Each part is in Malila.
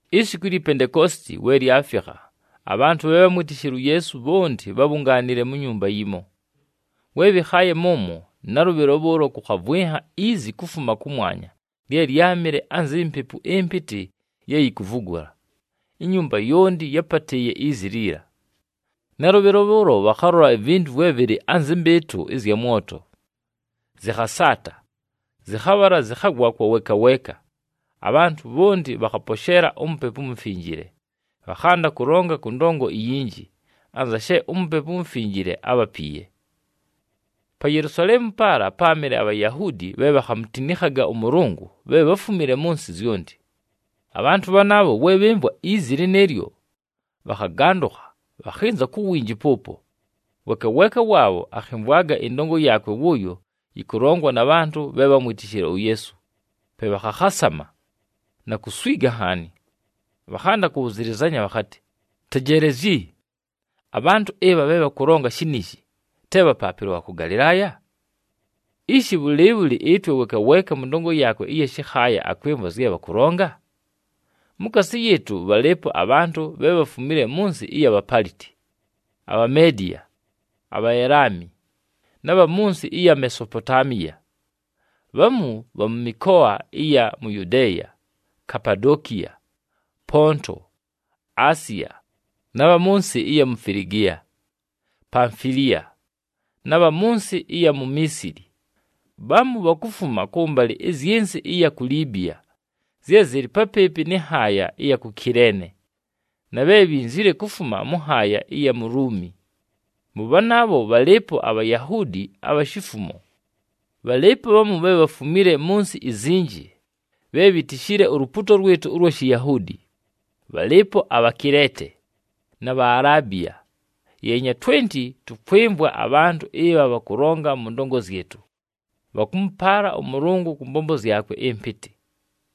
Isiku ilyi Pentekoositi we lyafikha, abhantʉ bhe bhámwitishile uYeesu, bhonti bhábhungaanile mu nyumba yimo. We bhɨkhaaye mʉmwo, nalʉbhɨlo bhʉʉlo kʉkhavwɨnha izi kufuma kʉmwanya lye lyámɨle anzi mpepu ɨmpɨtɨ ye yikuvugula, inyumba yonti yápatɨɨye izi liila. Nalʉbhɨlo bhʉʉlo bhakhalola ivintu vwe vɨlɨ anzɨ mbɨɨtʉ ɨzya mwoto, zɨkhasaata, zɨkhabhala zɨkhagwa kwa weeka weeka. Abhantʉ bhonti bhakhaposheela uMupepu uMufinjile, bhakhanda kʉlonga kʉ ndongo iyinji, anza she uMupepu uMufinjile ábhapiiye. Pa Yelusaleemu paala páamɨle aBhayahuudi bhe bhakhamutinikhaga ʉMʉlʉngʉ bhe bháfumile mʉ nsɨ zyonti. Abhantʉ bhanaabho we bhɨmvwa izi lɨnɨɨlyo, bhakhagandʉkha, bhakhɨnza ku winji pʉʉpo. Weeka weeka waabho akhɨmvwaga ɨndongo yaakwe wʉʉyo yɨkʉlongwa na bhantʉ bhe bhámwitishile uYeesu, pe bhakhakhasama, na kuswiga nhaani. Bhakhanda kʉbhʉzɨlɨzanya bhakhatɨ, “Tejeelezyi! Abhantʉ ɨbha bhe bhakʉlonga shiniishi, te bhapaapɨlwa bha kʉ Galɨlaaya? Ishi! Bhʉlɨɨbhʉlɨ ɨtwe weeka weeka mʉ ndongo yaakwe ɨya shɨkhaaya akwɨmvwa zye bhakʉlonga? Mukaasi yɨɨtʉ, bhalɨɨpo abhantʉ bhe bhafumile mʉ nsɨ ɨya Bhapaliti, aBhamediya, aBhaelami, na bha mʉ nsɨ ɨya Mesopotaamiya. Bhamu bha mʉ mɨkoa ɨya mu Yudeeya, Kapadokiya, Ponto, Asiya, na bha mʉ nsɨ ɨya mu Filigiya, Pamfiliya, na bha mʉ nsɨ ɨya mu Miisili. Bhamu bhakufuma kʉmbalɨ ɨzyɨ nsɨ ɨya ku Libiya zye zɨlɨ papɨɨpɨ nɨ nhaaya ɨya ku Kileene, na bhe bhinzile kufuma mʉ nhaaya ɨya mu Luumi. Mʉ bhanaabho bhalɨɨpo aBhayahuudi abha shifumo. Bhalɨɨpo bhamu bhe bhafumile mʉ nsɨ izinji bhe bhitishile ulupuuto lwɨtʉ ʉlwa Shiyahuudi, bhalɨɨpo aBhakileete, na Bhaalabiya. Yeenya twenti, tʉkwɨmvwa abhantʉ ɨbha bhakʉlonga mʉ ndongo zyɨtʉ, bhakʉmʉpaala ʉMʉlʉngʉ kʉ mbombo zyakwe ɨmpɨtɨ!”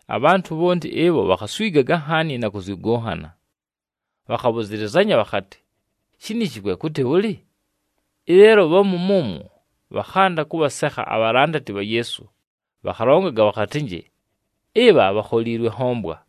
Abhantʉ bhonti ɨbho bhakhaswigaga nhaani na kʉzyʉgʉnhana, bhakhabhʉzɨlɨzanya bhakhatɨ, “Shiniishi kwe kʉtɨ bhʉlɨ?” Ɨleelo bhamu mʉmwo bhakhanda kʉbhasekha abhalandati bha Yeesu, bhakhalongaga bhakhatɨnjɨ, “Ɨbha bhakholiilwe nhombwa.”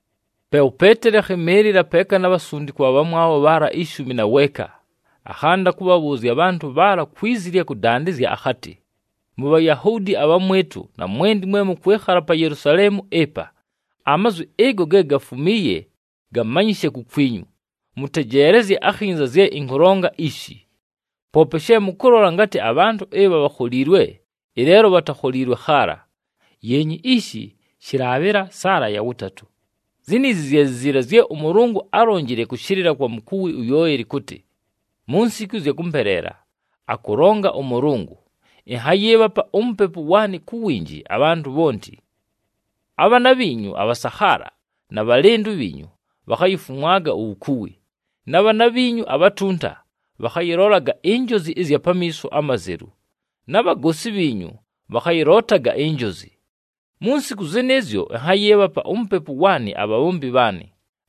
Pe uPeeteli akhɨmɨɨlɨla, peeka na bhasundikwa abhamwabho bhaala ishumi na weeka, akhanda kʉbhabhʉʉzya abhantʉ bhaala kwi zi ɨlya kʉdandɨzya akhatɨ, “MuBhayahuudi abhamwɨtʉ, na mwenti mwe mʉkwɨkhala pa Yelusaleemu ɨpa, amazwi ɨgo ge gafumiiye gamanyɨshe kukwinyu, mʉtejeelezye akhinza zye ɨnkʉlonga ishi. Poope she mʉkʉlola ngatɨ abhantʉ ɨbha bhakholiilwe, ɨleelo bhatakholiilwe khaala, yeenyi ishi shɨlaabhɨla saala ya wʉtatʉ! Ziniizi zye zi ziila zye ʉMʉlʉngʉ álonjile kʉshɨlɨla kwa mukuwi uYoeli kʉtɨ, ‘Mu nsiku ɨzya kʉmpeleela, akʉlonga ʉMʉlʉngʉ, ɨnhayɨɨbhapa uMupepu waanɨ ku winji abhantʉ bhonti. Abhaana bhiinyu abhasakhaala na bhalɨndʉ bhiinyu bhakhayifumwaga uwukuwi, na bhaana bhiinyu abhatunta bhakhayɨlolaga injozi ɨzya pamiiso amazelu, na bhagoosi bhiinyu bhakhayɨlootaga injozi. Mu nsiku zɨnɨɨzyo ɨnhayɨɨbhapa uMupepu waanɨ abhabhombi bhaanɨ,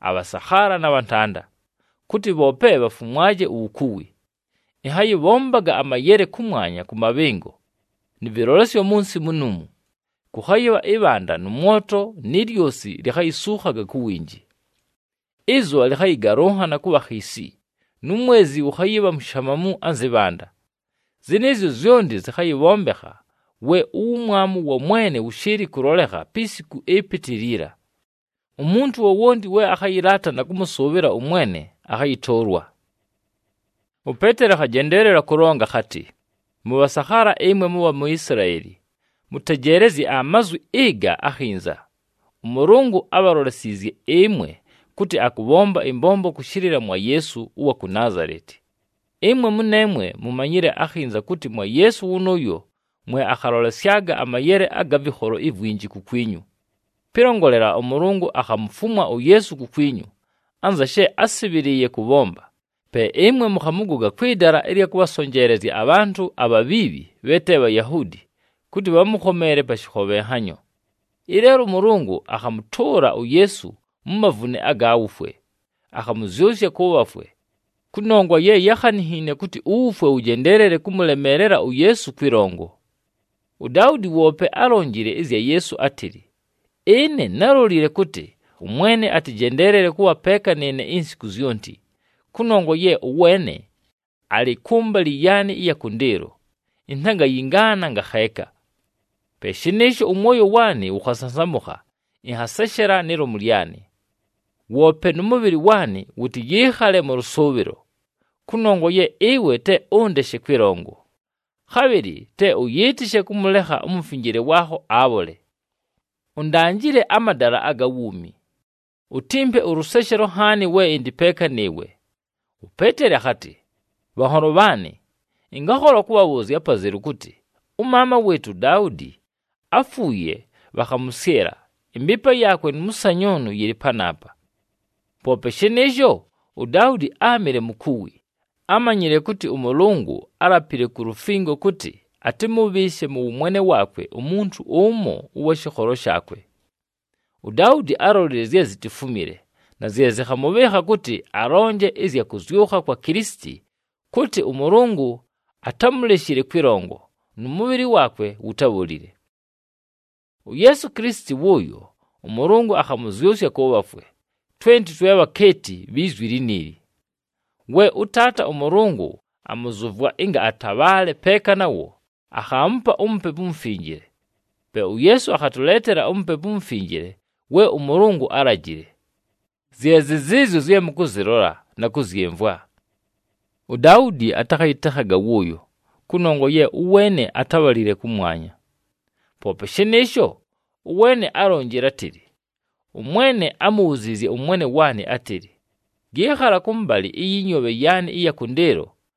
abhasakhaala na bhantanda, kʉtɨ bhoope bhafumwaje uwukuwi. Ɨnhayɨbhombaga amayele kʉmwanya kʉ mabhɨngo, nɨ vɨlolesyo mʉ nsɨ munuumu. Kʉkhayɨbha ɨbhanda, nʉ mwoto, ni lyosi likhayisuukhaga ku winji. Ɨzʉbha lɨkhayɨgalʉnhana kʉbha khiisi, nu mwezi wʉkhayɨbha mushamamu anzɨ bhanda. Zɨnɨɨzyo zyonti zɨkhayɨbhombekha we uwumwamu wa Mwene wʉshɨɨlɨ kʉlolekha pi siku ɨpɨtɨ liila. Umuntu wowonti we akhayɨlaata na kʉmʉsʉʉbhɨla ʉMwene akhayɨtʉʉlwa.’” UPeeteli akhajendeelela kʉlonga akhatɨ, “Mʉbhasakhaala ɨmwe mʉbha mu Isilaeli, mʉtejeelezye amazwi ɨga akhinza! ɄMʉlʉngʉ ábhalolesiizye ɨmwe kʉtɨ akʉbhomba ɨmbombo kʉshɨlɨla mwa Yeesu ʉwa ku Naazaleti. Ɨmwe mʉneemwe mumanyile akhinza kʉtɨ mwa Yeesu wʉnʉʉyo mwe akhalolesyaga amayele aga vɨkholo ivwinji kukwinyu. Pɨlongolela, ʉMʉlʉngʉ akhamufumwa uYeesu kukwinyu, anza she ásɨbhɨlɨɨye kʉbhomba, pe ɨmwe mʉkhamʉgoga kwɨ dala ɨlya kʉbhasonjeelezya abhantʉ abhabhiibhi bhe te Bhayahuudi kʉtɨ bhamʉkhomeele pa shɨkhobhenhanyo. Ɨleelo ʉMʉlʉngʉ akhamʉtʉʉla uYeesu mu mavune aga wufwe, akhamʉzyʉsya kʉ bhafwe, kʉnongwa ye yákhaninhiine kʉtɨ uwufwe wʉjendeelele kʉmʉlemeelela uYeesu kwɨlongo. UDaudi woope álonjile ɨzya Yeesu átɨlɨ, ‘Ɨne nálolile kʉtɨ, ʉMwene atɨjendeelele kʉbha peeka nɨɨne insiku zyonti. Kʉnongwa ye ʉweene alɨ kʉmbalɨ yaanɨ ɨya kʉndɨɨlo, intangayingaana ngakheeka. Pe shɨnɨɨsho, ʉmwoyo waanɨ wʉkhasansamʉkha, ɨnhaseshela ni lomu lyanɨ. Woope nʉ mʉbhɨlɨ waanɨ wʉtɨyɨɨkhale mʉ lʉsʉʉbhɨlo, kʉnongwa ye ɨwe te ʉndeshe kwɨlongo, khabhɨlɨ te ʉyɨɨtɨshe kʉmʉlekha uMufinjile waakho, abhole. Undanjile amadala aga wuumi. Utimpe ʉlʉseshelo nhaani we ɨndɨ peeka nɨɨwe.’” UPeeteli akhatɨ, “Bhanholo bhaanɨ, ɨngakhola kʉbhabhʉʉzya apazelu kʉtɨ ʉmaama wɨɨtʉ uDaudi áfuuye, bhakhamʉsyɨla, ɨmbɨɨpa yaakwe nʉ mʉsanyʉʉnʉ yɨlɨ panaapa. Poope shɨnɨɨsho, uDaudi áamɨle mukuwi, ámanyile kʉtɨ ʉMʉlʉngʉ álapile ku lufingo kʉtɨ atɨmʉbhɨɨshe mʉ wʉmwene waakwe umuntu ʉmo ʉwa shɨkholo shaakwe. UDaudi álolile zye zitifumile, na zye zɨkhamʉbhɨɨkha kʉtɨ alonje ɨzya kʉzyʉkha kwa Kilisiti kʉtɨ, ʉMʉlʉngʉ atámuleshile kwɨlongo, nʉ mʉbhɨlɨ waakwe wutábholile. “UYeesu Kilisiti wʉnʉʉyo, ʉMʉlʉngʉ akhamʉzyʉsya kʉ bhafwe, twenti twe bhakeeti bhi zwi liniili. We ʉTaata ʉMʉlʉngʉ amʉzʉvwa, ɨnga atabhaale peeka nawo, akhaamupa uMupepu uMufinjile. Pe uYeesu akhatʉleetela uMupepu uMufinjile we ʉMʉlʉngʉ álajile, zye zɨ zɨɨzyo zye mʉkʉzɨlola, na kʉzyɨmvwa. UDaudi atakhayɨtekhaga wʉʉyo kʉnongwa ye ʉweene atábhalile kʉmwanya. Poope shɨnɨɨsho, ʉweene álonjile átɨlɨ, ‘ɄMwene ámubhuziizye ʉMwene waanɨ átɨlɨ, “Yɨɨkhala kʉmbalɨ ɨyɨ nyoobhe yaanɨ ɨya kʉndɨɨlo,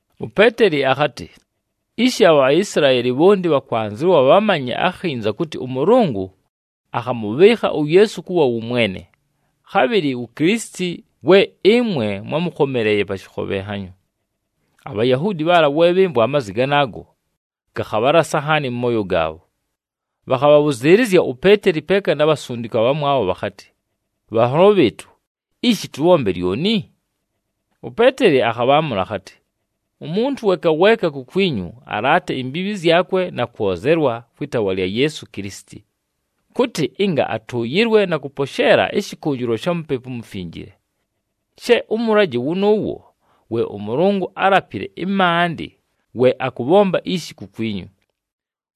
UPeeteli akhatɨ, “Ishi, aBhaisilaeli bhonti bhakwanzɨwa bhamanye akhinza kʉtɨ ʉMʉlʉngʉ akhamʉbhɨɨkha uYeesu kʉbha wʉ Mwene, khabhɨlɨ wu Kilisiti, we ɨmwe mwámʉkhomeleeye pa shɨkhobhenhanyo.” ABhayahuudi bhaala, we bhɨmvwa amazwi ganaago, gakhabhalasa nhaani mʉ mooyo gaabho. Bhakhabhabhʉzɨɨlɨzya uPeeteli peeka na bhasundikwa abhamwabho bhakhatɨ, “Bhanholo bhɨɨtʉ, ishi tʉbhombe lyoni?” UPeeteli akhabhaamʉla akhatɨ, “Umuntu weeka weeka kukwinyu alaate imbiibhi zyakwe na kwozelwa kwɨ taawa lya Yeesu Kilisiti, kʉtɨ ɨnga atʉʉyɨlwe na kʉposheela ɨshɨkʉnjɨlwa sha Mupepu uMufinjile. She ʉmʉlajɨ wʉnʉʉwo we ʉMʉlʉngʉ álapile ɨmaandɨ we akʉbhomba ishi kukwinyu,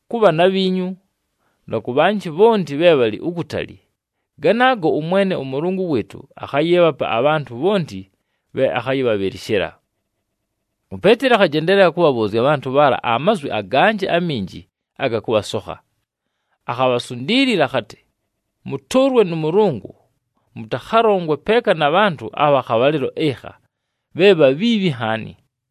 kʉ bhaana bhiinyu, na kʉ bhanjɨ bhonti bhe bhalɨ ukutali. Ganaago ʉMwene ʉMʉlʉngʉ wɨɨtʉ akhayɨɨbhapa abhantʉ bhonti bhe akhayɨbhabhɨlɨshɨla.” UPeeteli akhajendeelela kʉbhabhʉʉzya abhantʉ bhaala amazwi aganjɨ aminji aga kʉbhasokha. Akhabhasundiilila akhatɨ, “Mʉtʉʉlwe nʉ Mʉlʉngʉ mʉtakhalongwe peeka na bhantʉ abha khabhalɨlo ɨkha, bhe bhabhiibhi nhaani!”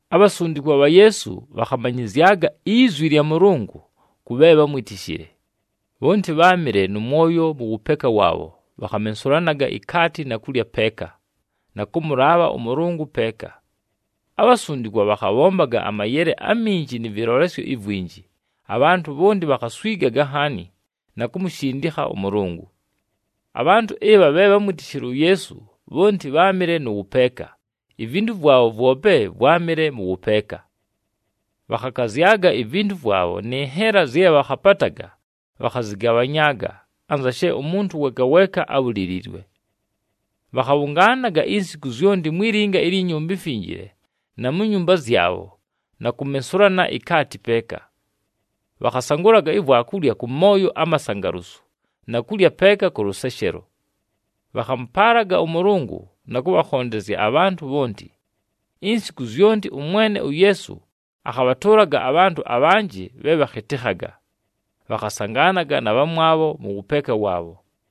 Abhasundikwa bha Yeesu bhakhamanyɨzyaga izwi lya Mʉlʉngʉ kʉ bhe bhámwitishile. Bhonti bháamɨle nʉ mwoyo mʉ wʉpeeka waabho, bhakhamensulanaga ikaati na kulya peeka, na kʉmʉlaabha ʉMʉlʉngʉ peeka. Abhasundikwa bhakhabhombaga amayele aminji nɨ vɨlolesyo ivwinji, abhantʉ bhonti bhakhaswigaga nhaani, na kumushindikha ʉMʉlʉngʉ. Abhantʉ ɨbha bhe bhámwitishile uYeesu, bhonti bháamɨle mʉ wʉpeeka, ivintu vwabho vwope vwámɨle mʉ wʉpeeka. Bhakhakazyaga ivintu vwabho nɨ nhela zye bhakhapataga, bhakhazɨgabhanyaaga, anza she umuntu weeka weeka ábhuliliilwe. Bhakhabhʉngaanaga insiku zyonti mwi linga ilyi Nyumba iMfinjile, na mu nyumba zyabho na kumensulana ikaati peeka. Bhakhasangʉlaga ivwakulya kʉ mooyo amasangalusu na kulya peeka kʉ lʉseshelo. Bhakhamʉpaalaga ʉMʉlʉngʉ, na kʉbhakhondezya abhantʉ bhonti. Insiku zyonti ʉMwene uYeesu akhabhatʉʉlaga abhantʉ abhanjɨ bhe bhakhɨtɨkhaga, bhakhasangaanaga na bhamwabho mʉ wʉpeeka waabho.